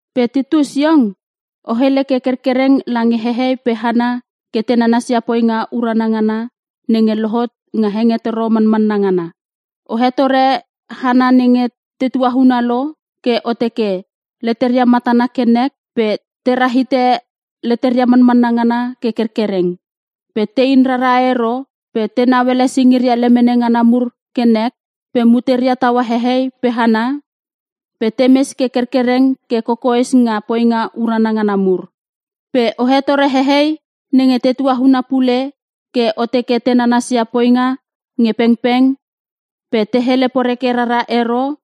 Pe Titus iong, o hele ke kerkereng lange hehei pe hana ke te nanasia poinga urana ngana nenge lohot nga hengetoro manmanna ngana. O hetore hana nenge te tuauna lo ke o teke; leteria matana ke nek pe tera hite leteria manmanna ngana ke kerkereng, pe tein rara ero, pe tenau ele singiria lemene ngana mur ke nek, pe muteria taua hehei pe hana, pe temes ke kerkekreng ke kokoes nga poinga urana ngana mur. Pe o hetore hehei nenge te tuauna pule ke o teke te nanasia poinga nge pengpeng, pe te hele poreke rara ero,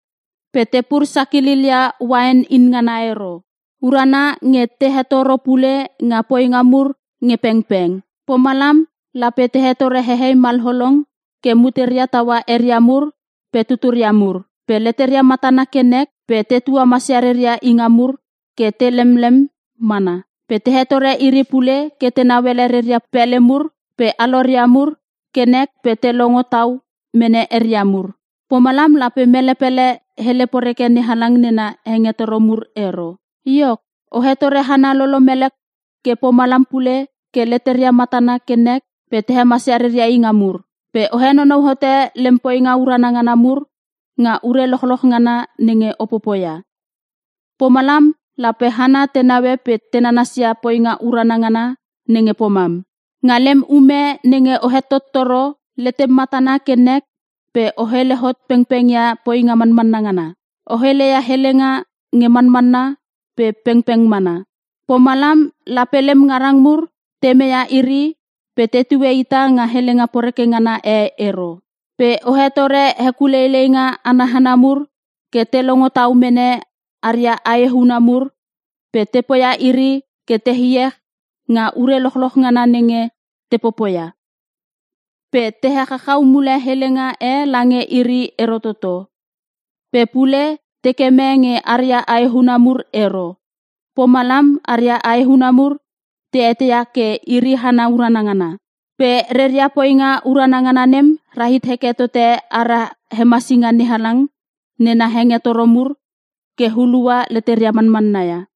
pe tepur sakililia uain in ngana ero. Urana nge te hetoro pule nga poinga mur nge pengpeng. Pomalam lape te hetore hehei malolong ke muteria taua eria mur pe tuturia mur. Pe leteria matana ke nek pe te tuamasia reria inga mur ke te lemlem mana. Pe te hetore iri pule ke tenau ele reria pele mur pe aloria mur ke nek pe te longo tau mene eria mur. Pomalam lape mele pele hele poreke NeHalang nena hengetoro mur ero. Iok, o hetore hana lolomele ke pomalam pule ke leteria matana ke nek pe te hemasia reria inga mur. Pe o henonou hote lem poinga urana ngana mur nga ure lochloch ngana nenge o popoia. Pomalam lape hana te naue pe te nanasia poinga urana ngana nenge pomam. Nga lem ume nenge o hetottoro, letem matana ke nek pe o hele hot pengpengia poinga manmanna ngana. O heleia helenga nge manmanna pe pengpeng mana. Pomalam lape lem ngarang mur te meia iri pe tetue ita nga helenga poreke ngana e ero. Pe o hetore hekuleileinga ana hana mur ke te longo tau mene aria ae huna mur pe te poia iri ke te iech nga ure lochloch ngana nenge te popoia. Pe te echachau mule helenga e lange iri ero toto. Pe pule te keme nge aria aehuna mur ero. Pomalam aria ae huna mur te eteia ke iri hana urana ngana. Pe reria poinga urana ngana nem rahit heke tote ara Hemasinga NeHalang nena hengetoro mur ke hulua leteria manmanna ia.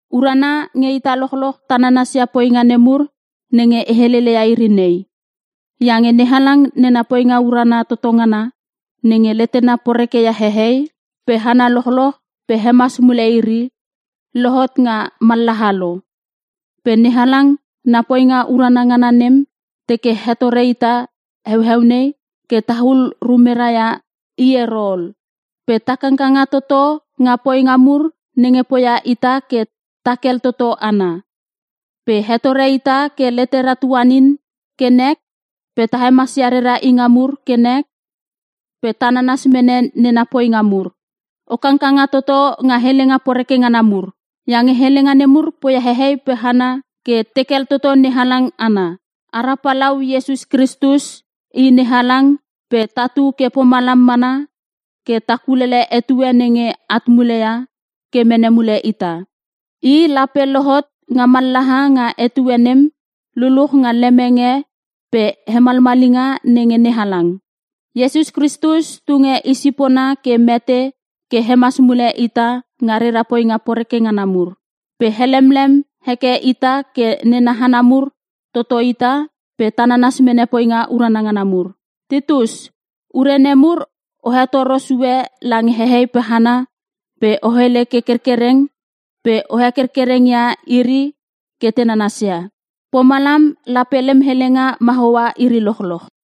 Urana nge ita lochloch ta nanasia poinga nemur nenge e heleleia iri nei. Iange NeHalang nena poinga urana toto ngana nenge letena porekeia hehei pe hana lochloch pe hemas mule iri, lohot nga mallaha lo. Pe NeHalang na poinga urana ngana nem teke hetore ita heueu nei ke tahul rumera ia i ero ol, pe ta kangkanga toto nga poinga mur nenge poia ita ke ta kel toto ana. Pe hetore ita ke letera tuanin ke nek pe ta hemasia rera inga mur ke nek pe ta nanas mene nena poinga mur. O kangkanga toto nga helenga poreke ngana mur, iange helenga nemur poia hehei pe hana ke tekel toto NeHalang ana. Ara Palau Iesus Kristus i NeHalang pe tatu ke pomalam mana ke ta kulele etue nenge at muleia ke mene mule ita. I lape lohot nga mallaha nga etue nem luluch nga lemenge pe hemalmalinga nenge NeHalang. Iesus Kristus tunge i sipona ke mete ke hemas mule ita nga rera poinga poreke ngana mur. Pe helemlem heke ita ke nena hana mur toto ita pe ta nanas mene poinga urana ngana mur. Titus, ure nemur o hetoro sue lange hehei pe hana pe o hele ke kerkereng pe o hekerkereng ia iri ke te nanasia. Pomalam lape lem helenga mahoa iri lochloch.